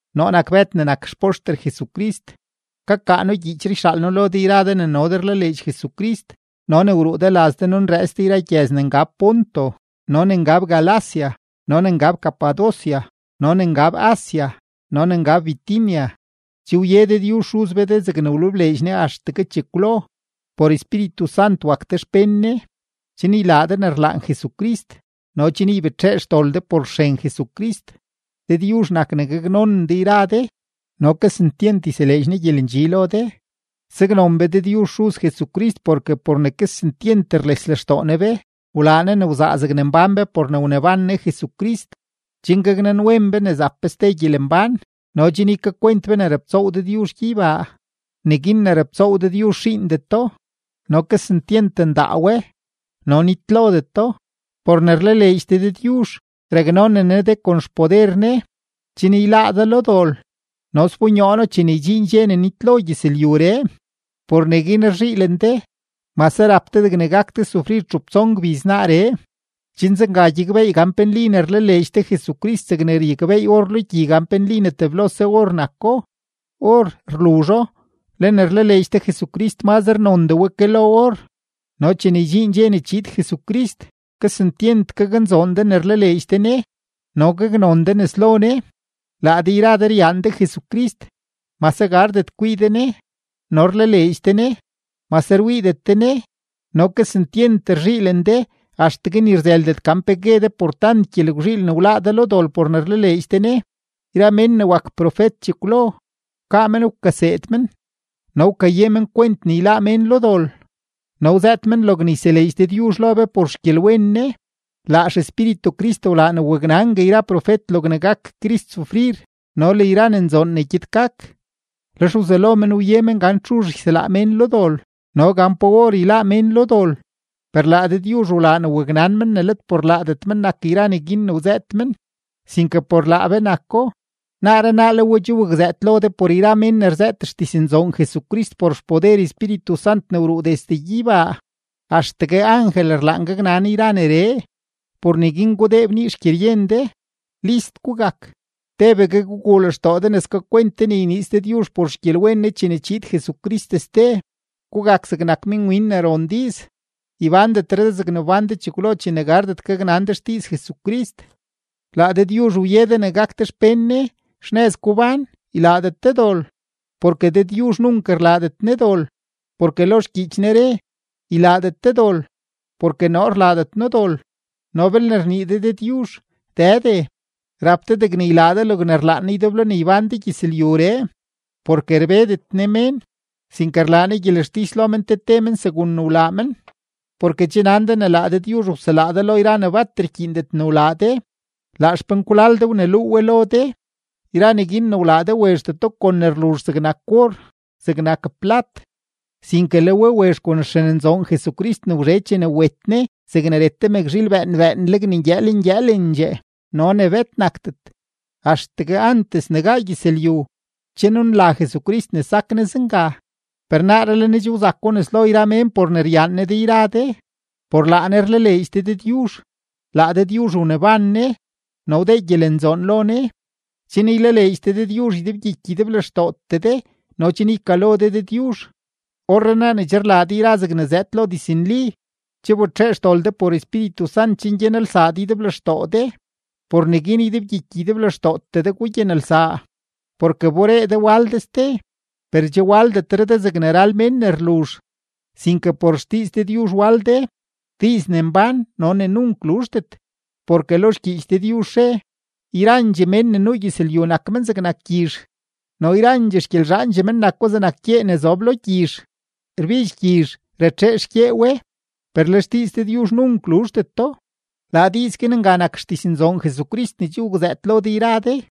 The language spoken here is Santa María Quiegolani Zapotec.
Noo nak Bëd ne nak xpoxter Jesucrist. Kakaa noo gyiichree yxaal noo lo de yra de ne no de rlaleedx Jesucrist no ne wruu de laz de nunrëëts de yra gyëz ne ngab Ponto no ne ngab Galacia no ne ngab Capadocia no ne ngab Asia no ne ngab Bitinia. Che wye Dëdyuzh Xuz be de zegne wlebleedx Ne axtegue chekwlo. Por Espíritu Sant wak de xpén Ne, chen ylaa de ne rlaan Jesucrist no chen ybetxee xdol de por xren Jesucrist. Dëdyuzh nak ne gaknonen de yra de no kesentyent yseleedx Ne gyelendxi lo de. Saknon be Dëdyuzh Xuz Jesucrist, porke por ne kesentyent rles lextoo Ne be wlaa Ne ne wzaa zegne mbán be por ne wneban Ne Jesucrist, chen gaknanwen be ne zap be ste gyelembán no chen ykakwent be ne raptsoow Dëdyuzh gyeybaa; neguin ne raptsoow Dëdyuzh xiindeto, no kesentyent ndaa we, no nitlodeto. Por ne rlaleedx de Dëdyuzh raknonen Ne de kon xpoder Ne, chen yláá de lo dol no sbonyoo No chene ydxiin dxe ne nitlo gyëzlyuree. Por neguin rzhiilen de, mase rap de degne gak de sufrir txup tson gbiz naaree, chen zenga gyakbeey gan pe nli ne rlaleedx de Jesucrist zegne ryakbeey or lo gyi gan pe nli teblose or nako. Or rluzho, le ne rlaleedx de Jesucrist mazre nondee we ke lo or. No chene ydxiin dxe ne chiid Jesucrist kesentyent gaknzoon de ne rlaleedx de Ne no gaknon de nes lo Ne. Laa de yra de ryaan de Jesucrist, mase gardet kwii de Ne, no rlaleedx de Ne, mase rwiidet de Ne, no kesentyent rzhiilen de axtegue ni rzëëldet gan pe gue de por tant gyelgwzhiil ne wláá de lo dol por ne rlaleedx de Ne. Yra mén ne wak profet chekwlo, wkaa men wkaseed men no wkaye men kwent ne yláá mén lo dol, no wzëët men logne yseleedx Dëdyuzh lo be por xgyelwen Ne. Laa XEspíritu Crist wlaa ne waknangue yra profet logne gak Crist sufrir no le yra ne nzoon ne gyed gak, lex wzelo men wye men gan txuzh yselaa mén lo dol no gan pa or yláá mén lo dol. Per laa Dëdyuzh wlaa ne waknan men ne let por laadet men nak yra neguin ne wzëët men, sinke por laa be nako. Naaree naa le we che wakzëët lo de por yra mén ne rzëët xdiznzoon Jesucrist por xpoder Espíritu Sant ne wruu desde gyeybaa. Axtegue angel rlaan gaknan yra neree. Por neguin gudee bnii xgyeryen de, list gugak, tebegue guguu lextoo de ne skakwent de ne yniiz Dëdyuzh por xgyelwen Ne chene chiid Jesucrist ste. Gugak zegnak minwin ne ron diiz, ybándetre de zegne wbán de chekwlo chene gardet gaknan de xdiiz Jesucrist. Laa Dëdyuzh wye de ne gak de xpén Ne. Xnëz gubán, ylaadet de dol, porke Dëdyuzh nunk rlaadet Ne dol. Porke lo xgyiich Ne re: “Ylaadet de dol, porke noo rlaadet noo dol.” No belne rnii de Dëdyuzh “Dëde”, rap de degne ylaa de logne rlaan Ne ydeblo ne ybán de gyëzlyuree, porke rbedet Ne mén, sinke rlaa Ne gyelextis lo men te te men segun ne wlaa men. Porke che nan de ne laa Dëdyuzh wselaa de lo yra ne bat rkyiindet ne wlaa de; laa xpenkwlal de wneluu we lo de; yra neguin ne wlaa de wezhdeto kon ne rluzh zegnak or, zegnak plat, sinke le we wezh kon xren nzoon Jesucrist ne wzhe chene wet Ne zegne ret te mëkzhiil bëën bëënleg ne ngyëël ngyëëlendxee no ne bet nakdet. Axtegue antes ne gaa gyëzlyu, che nunla Jesucrist ne sak Ne zenga, per naaree le Ne che wzako nes lo yra mén por ne ryaan Ne de yra de. Por laa Ne rlaleedx de Dëdyuzh. Laa Dëdyuzh wneban Ne no wdee gyelenzoon lo Ne, chen ylaleedx de Dëdyuzh ydebgyiky ydeblextootee de no chen ykalo de Dëdyuzh. Orrenaa ne che rlaa de yra zegne zëëd lo diznli, che wbetxee xdol de por Espíritu Sant chen gyanelsaa de ydeblextoo de. Por neguin ydebgyiky ydeblextootee de gugyanelsaa. Porke wberee de wal de ste, per che waldetre de zegne ral mén ne rluzh, sinke por xdiiz Dëdyuzh wal de, diiz ne mbán no ne nunk luzhdet. Porke lo xgyiich Dëdyuzh re: Yrandxee mén ne nuu gyëzlyu nak men zegnak gyizh, no yrandxee xgyelzhaandxee men nako zegnak gyee ne zob lo gyizh. Rbidx gyizh, ratxee xgyee we. Per le xdiiz Dëdyuzh nunk luzhdeto. Laa diiz guin nga nak xdiznzoon Jesucrist ne che wakzëët lo de yra de.